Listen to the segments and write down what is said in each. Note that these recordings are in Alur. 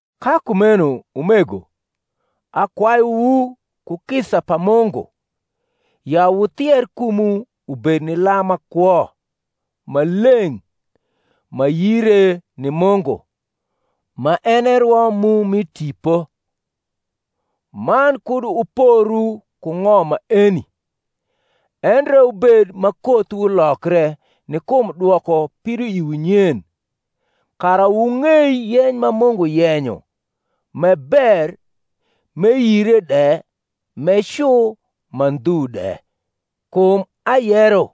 Ka kumeno, umego, akwayuwu ku kisa pa Mungu, ya wuthier kumwu ubed ni lam ma kwo, ma leng’, ma yire ni Mungu, ma en e rwo mu mi tipo. Man kud wuporu ku ng’om maeni: endre wubed ma kothwu lokre ni kum dwoko pidoiwu nyen, kara wung’ei yeny ma Mungu yenyo m’e ber m’e yire de m’e cu ma ndhu de. Kum ayero,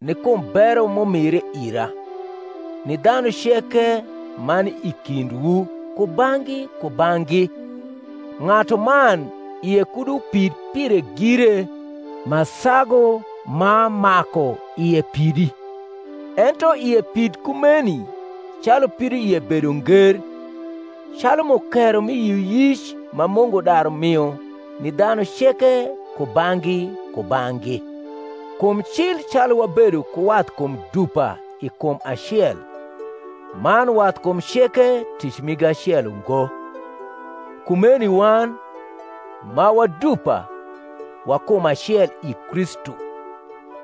ni kum bero m’umire ira, ni dhanu ceke ma ni i kindwu kubang’gi kubang’gi, ng’atuman ie kud upid pire gire ma sagu ma maku ie pidi; ento ie pid kumeni calu pidoie bedo nger, calu mukero mi yioyic ma Mungu daru mio ni dhanu ceke kubang’gi kubang’gi. Kum cil calu wabedo ku wathkum dupa i kum acel, man wathkum ceke tic migi acel ungo: kumeni wan, ma wa dupa, wa kum acel i Kristu,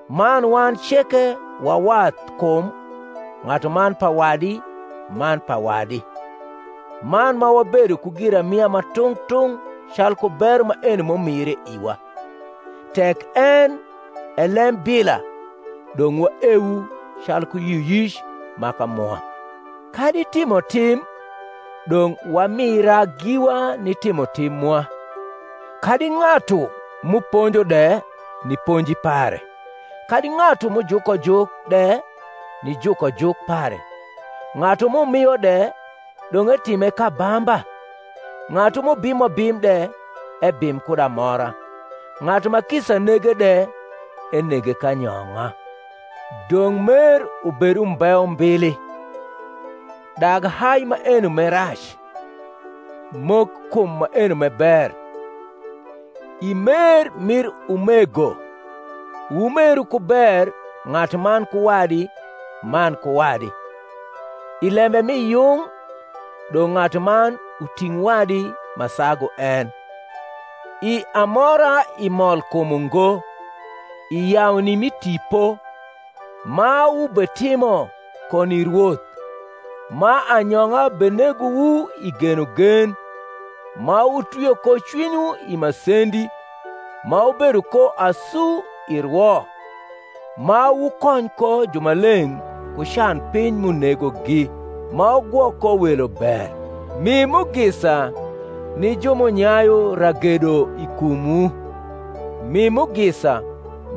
man wan ceke wa wathkum ng’atuman pa wadi man pa wadi. Man ma wabedo ku giramia ma tung’ tung’ calku bero maeni m’umire iwa, tek en e lembila, dong’ waeu calku yioyic maka mwa; kadi timotim, dong’ wamira giwa ni timotim mwa; kadi ng’atu m’uponjo de, ni ponji pare; kadi ng’atu m’ujuko juk de ni jukojuk pare: ng’atu m’umio de, dong’ etime k’abamba; ng’atu m’ubimo bim de, ebim kud amora; ng’atu ma kisa nege de, enege k’anyong’a. Dong’ mer ubed umbe umbili. Dag hai maeno m’e rac; mok kum maeno m’e ber. I mer mir umego wumeru ku ber ng’atuman ku wadi man ku wadi; i lembe mi yung dong’ ng’atuman uting’ wadi ma sagu en; i amora i molkum ungo; i yauni mi tipo; ma wubetimo ko ni Rwoth, ma anyong’a benegowu i genogen; ma wutwio ko cwinywu i masendi; ma wubedo ko asu i rwo; ma wukony ko jumaleng’ ku canpiny m’unegogi; ma wugwok ko welo ber. Mi mugisa ni ju m’unyayu ragedo i kumwu; mi mugisa,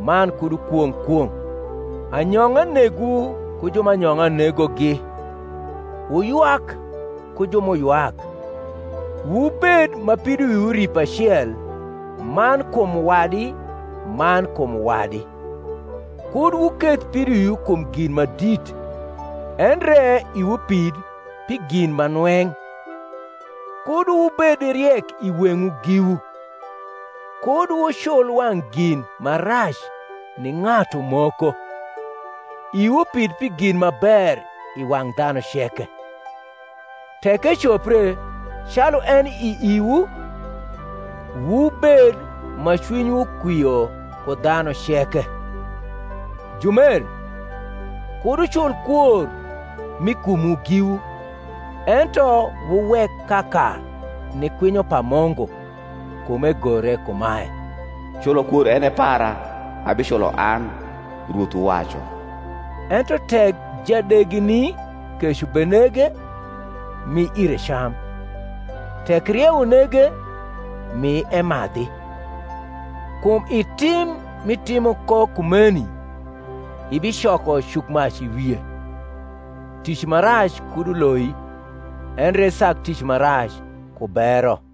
man kud wukwong’ kwong’. Anyong’a negwu ku ju ma anyong’a negogi; wuywak ku ju m’uywak. Wubed ma pidoiwu ripo acel man kum wadi man kum wadi. Kud wuketh pidoiwu kum gin ma dit, endre iwu pid pi gin ma nweng’. Kud wubed riek i weng’wu giwu. Kud wucul wang’ gin ma rac ni ng’atu moko. Iwu pid pi gin ma ber i wang’ dhanu ceke. Tek ecopre, calu eni i iwu, wubed ma cwinywu kwio ku dhanu ceke. Jumer, kud wucul kwor mi kumwu giwu, ento wuwek kaka ni kwinyo pa Mungu: kum egore kumae, Culo kwor en e para; abiculo an, Rwoth uwacu. Ento tek jadegini kec ubenege, mi ire cam; tek rieu unege, mi emadhi: kum i tim m’itimo ko kumeni ibicoko cukmac i wie. Tic ma rac kud uloi, endre isag tic ma rac ku bero.